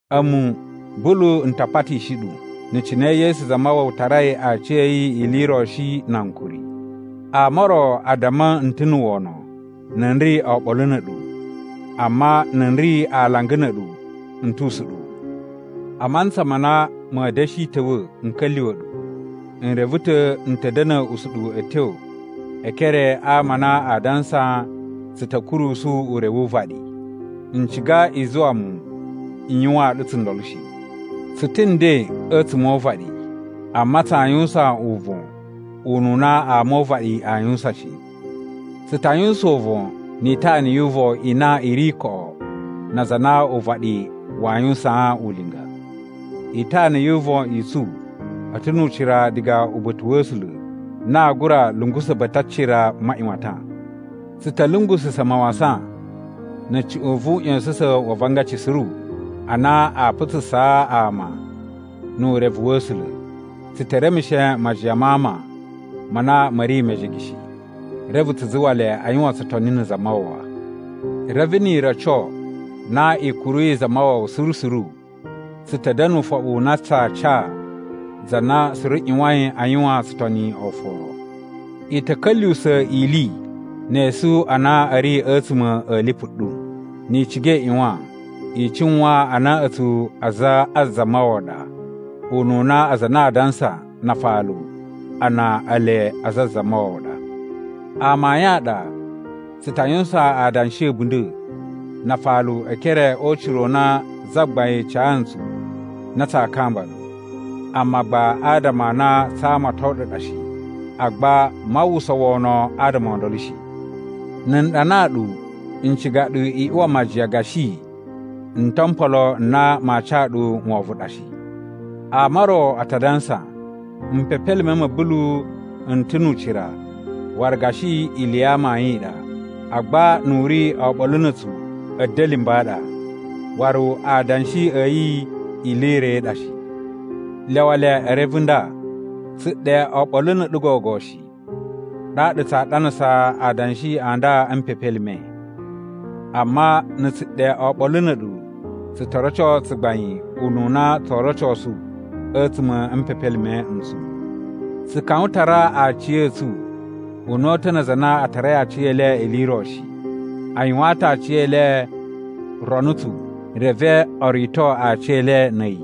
A̱mu, Bulu n ta patishi ɗu na̱ cine Yesu Zamawawa tarai aciya̱yi ili i ro shi na ankuri. Ama o ro a damma n ta̱ na̱ wono na̱ n ri oɓolo na̱ a̱ɗu amma na̱ n ri alanga na̱ a̱ɗu n tu usuɗuwu. A mantsa ma na ma̱a̱ da̱shi ta̱wa̱ n ka̱lyuwa̱ ɗu, n reve ta̱ n ta̱ da̱na̱ usuɗuwu a̱ tyo e ekere a ama a na aa dansa tsu ta̱ kurusu ure wu uvaɗi. N ciga i zuwa mu n yuwaan ɗu tsundolo shi. Tsu ta̱ nden a̱tsuma̱ o uvaɗi, amma tsaa yuwusan uvon ununa ama o uvaɗi aa yuwusan shi. Tsu ta yuwusan uvon ni itana yu uvon i na i ri koꞌo na aza a na uvaɗi waa yuwusaan ulinga. Itana yu uvon i tsu a̱ ta̱ nu ucira diga uba̱ta̱ wa̱ A̱sula̱ na aa gura lungusa̱ ba̱ta̱ a cira maꞌyuwatan. Tsu ta̱ lungususa̱ mawasan na̱ cuꞌun vu uꞌya̱sa̱sa̱n wa avangaci suru a na a putsusaa ama nu urevu wa̱ A̱sula̱. Tsu te remushe majiyan ma ama ma na ma̱ ri mejege shi, reve tsu zuwa le a yuwan tsutoni na̱ Zamawawa. Reve ni i roco na i kuruyi Zamawawa suru suru, tsu ta̱ da̱na̱ ufoɓu u na tsaa ca za na suru ꞌyuwain a yuwan tsutoni oforo. I ta̱ ka̱lyuwusa̱ ili ne esu a na a̱ ri a̱tsuma̱ a̱ lipu ɗu. Ni i ciga i ꞌyuwan i cuwan a na a̱tsu aza a Zamawawa ɗa ununa aza a na a dansa na afalu a na ele aza a Zamawawa ɗa. Amayun a ɗa tsu ta yuwusan adanshi a̱bunda̱ na afalu e ekere o ucira u na Zagbain ca ntsu na tsaa kamba ɗu, amma gba adama a na tsaa amaton ɗu ɗa shi. Agba maa uwwusa wono adama o ndolo shi. Na̱ n ɗanaa ɗu, n ciga ɗu i uwa majiyan gashi n to mpolo n na maa ca ɗu wovon ɗa shi. Ama o ro a ta dansa, “Mpepelime ma̱ Bulu n ta̱ nu ucira waru gashi ili ya amayun i ɗa, agba nu u ri oɓolo na̱ a̱tsu a̱da̱limba̱ a ɗa. Waru adanshi a̱ yi ili i ro i ɗa shi.” Lyawa le e reve nda: Tsu ɗe oɓolo na̱ a̱ɗu gogo shi, ɗaɗa tsaa ɗanasa adanshi a nda a̱ mpepelime. Amma na̱ tsu ɗe oɓolo na̱ a̱ɗu, tsu to roco tsugbain ununa tsoo rocosu a̱tsuma̱ a̱ mpepelime n tsu. Tsu kawan tara aciya̱tsu una̱ta̱ na aza a na a tarai aciyele ili i ro shi. A yuwaan ta̱ aciyele ronutsu reve o rito aciyele na̱ a̱yi.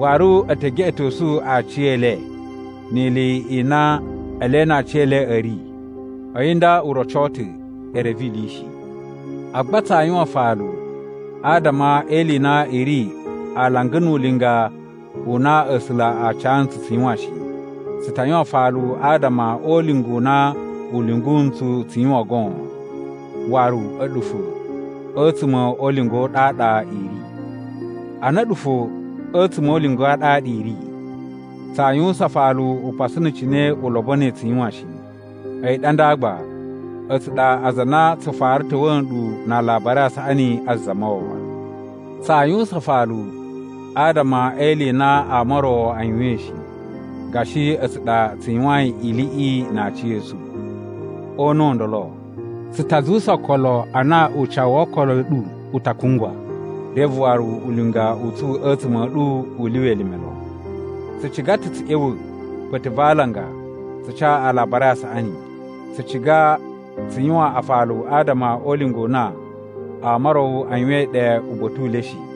Waru e te geꞌetosu aciyele ni ili i na ele na aciyele a̱ ri. A̱yi nda u roco ta̱ e reve ili shi. Agba tsaa yuwan afalu adama e ili i na i ri alanga nu ulinga u na A̱sula̱ a ca ntsu tsu yuwan shi. Tsu ta yuwan afalu adama o ulinga u na u lyungu ntsu tsu yuwan goon, waru a̱ɗu fo a̱tsuma̱ o ulinga u ɗaɗa i ri. Ana a̱ɗu fo a̱tsuma̱ o ulinga a ɗaɗa i ri, tsaa yuwusan afalu upasu na̱ cine u lobonoi tsu yuwan shi. A̱yi ɗa nda gba, a̱tsu ɗa aza a na tsu fara ta̱wa̱a̱ nɗu na Alabari a Saꞌani a Zamawawa. Tsaa yuwusan afalu adama e ili i na ama o ro a yuwain shi, gashi a̱tsu ɗa tsu yuwain iliꞌi na aciya̱tsu. O una̱ u ndolo, tsu ta zuwusa okolo a na ucawu wo okolo a̱ ɗu u ta kungwa, reve waru ulinga u tsu a̱tsuma̱ a̱ ɗu u lyuwa elime lon. Tsu ciga ta̱ tsu ꞌya̱wa̱ ba̱ta̱ va alanga tsu ca Alabari a Saꞌani. Tsu ciga tsu yuwan afalu adama o ulinga u na ama o ro a yuwain ɗe uba̱ta̱ u le shi.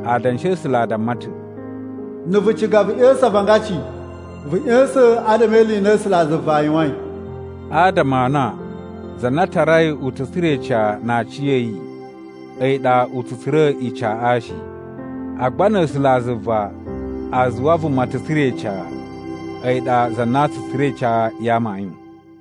Adanshi a̱ A̱sula̱ a damma ta̱, “Na̱ vu ciga vu ꞌya̱sa̱n avangaci, vu ꞌya̱sa̱n adama e ili i na A̱sulazuva a yuwain.” Adama a na za na tarai u ta̱ tsura̱ ica na aciya̱yi a̱yi ɗa u tsu tsura̱ icaꞌa shi. Agba na̱ A̱sulazuva a zuwa vuma ta̱ tsura̱ ica, a̱yi ɗa za na tsu tsura̱ ica ya amayun.